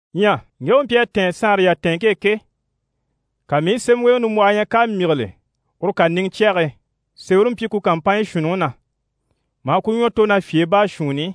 Ɲyɛ ŋge u mpyi a tɛ̀ɛn saanre yatɛɛnŋke e ke, ka mii i sémɛweŋɛ nimbwɔhɔ ɲya k'à myígile uru kàniŋɛ cyɛge e. Sémɛre mpyi ku kàmpanɲyi shuunniŋi na, maa ku ɲwɔ tò ná fyèe baashuunni i.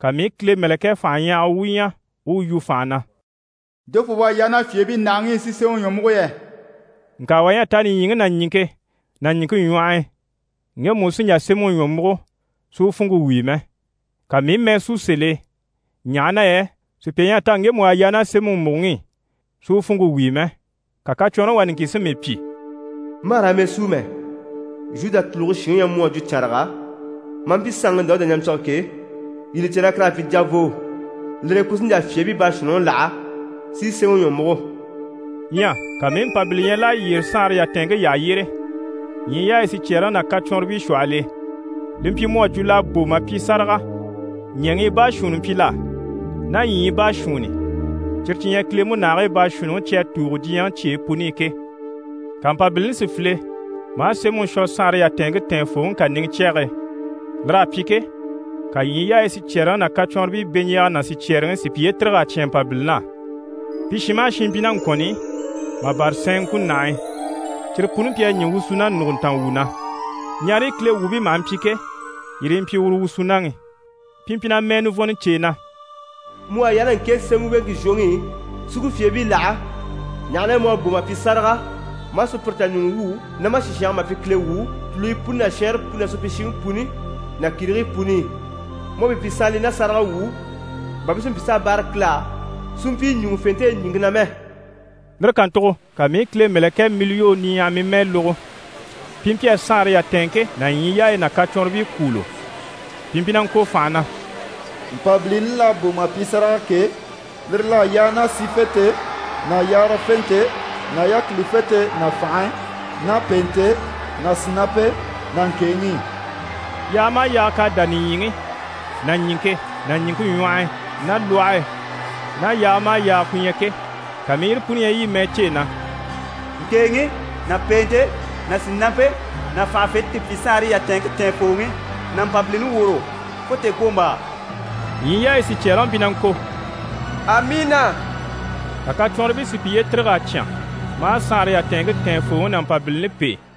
Ka mii i Kile mɛ̀lɛkɛ fanhaɲyahaga wu ɲya u u yu fànha na: «Jofoo u à yaa ná fyèebii ndàhaŋi i si sémɛŋi ɲwɔ múgo yɛ?» Ŋka wà ɲyɛ a ta nìɲyiŋi ná ɲìŋke ná ɲìŋke ɲwɔh'i, ŋgemu u sí n‑jà sémɛŋi ɲwɔ múgo si u funŋke wíi mɛ. Ka mii i mɛɛ sú sèl'e, ɲaha na yɛ sùpya ɲyɛ a ta ŋgemu u à yaa ná sémɛŋi mùgoŋi i, si u funŋke wíi mɛ. Ka kacwɔnrɔŋi wà niŋkin si mii pyi: «Ma hà raa mɛɛ súu mɛ. Zhuda tùluge shinŋi u ɲyɛ mu à jwo cànraga, maa mpyi saanŋi Dawuda ɲampyige ke, yii li cè na kur'à pyi javoo. Lire e, ku sí n‑jà fyèebii baashuunniŋi láha, si sémɛŋi ɲwɔ múgo.» Ɲyɛ ka mii i Mpabili ɲya l'à yyére saanre yatɛɛnŋke yyaha yyére, ɲyii yaayi sicyɛɛreŋi ná kacwɔnribii shwɔhɔl'e. Li mpyi mu à jwo l'à bò mà pyi sáraga. Ɲɛ̀ŋii baashuunni mpyi l'á, ná ɲyii baashuunni, cyire cyi ɲyɛ Kile múnahigii baashuunniŋi cyi à tùugo diɲyɛŋi cyeyi puni i ke. Ka Mpabilini si file maa sémɛŋi shwɔ saanre yatɛɛnŋke tɛɛnfooŋi kàniŋɛ cyɛge e. Lir'à pyi ke, ka ɲyii yaayi sicyɛɛreŋi ná kacwɔnribii beɲjaaga ná sicyɛɛreŋi si piye tîrig'a cyán Mpabilini á. Pi shin maha shin mpyi ná ŋkɔ̀nn'i, mà bâra sɛɛn ŋkunahii, cyire puni mpyi a ɲî wusuna nùguntanga wu na. Ɲareyi Kile wuubii maha mpyi ke, yire yi mpyi uru wusunaŋi. Pi mpyi na mɛɛ nivɔnnɔ cêe na: «Mu u à yaa ná ŋke sémɛweŋke zhwoŋi i, si ku fyèebii láha, ɲaha na yɛ mu à bò mà pyi sáraga, maa sùpyire tà ɲùŋɔ wwû ná ma sìshange e mà pyi Kile wuu, tùluyi puni ná shɛɛnre puni ná supyishiŋi puni ná kìrigii puni i. Mu à pi pyi saanlii ná sáragawwuu, bà pi si mpyi s'a báare Kile á, si mpyi ɲùŋufente e ɲìŋke na mɛ.» Lire kàntugo ka mii i Kile mɛ̀lɛkɛɛ miliyoo niɲyahaɲyahamii mɛɛ lógo. Pi mpyi a saanre yatɛɛnŋke ná ɲyii yaayi ná kacwɔnribii kwûulo. Pi mpyi na ŋko fànha na: «Mpabilini l'à bò mà pyi sáraga ke, lire l'à yaa ná sífente ná yaarafente ná yákilifente ná fànhe ná pèente ná sìnampe ná ŋkèeŋi i.» Yaaga maha yaaga k'à dá nìɲyiŋi ná ɲìŋke ná ɲìŋke ɲwɔh'i ná lwɔhe e ná yaaga maha yaaga ku ɲyɛ ke, ka mii i yire puni ɲya yi i mɛɛ cêe na: «Ŋkèeŋi ná pèente ná sìnampe ná fànhafente ti pyi saanre yatɛɛnŋke tɛɛnfooŋi ná Mpabilini woro, fo tèekwombaa!» Ɲyii yaayi sicyɛɛreŋi mpyi na ŋko: «Amiina». Ka kacwɔnribii si piye tîrig'a cyán, maa saanre yatɛɛnŋke tɛɛnfooŋi ná Mpabilini pêe.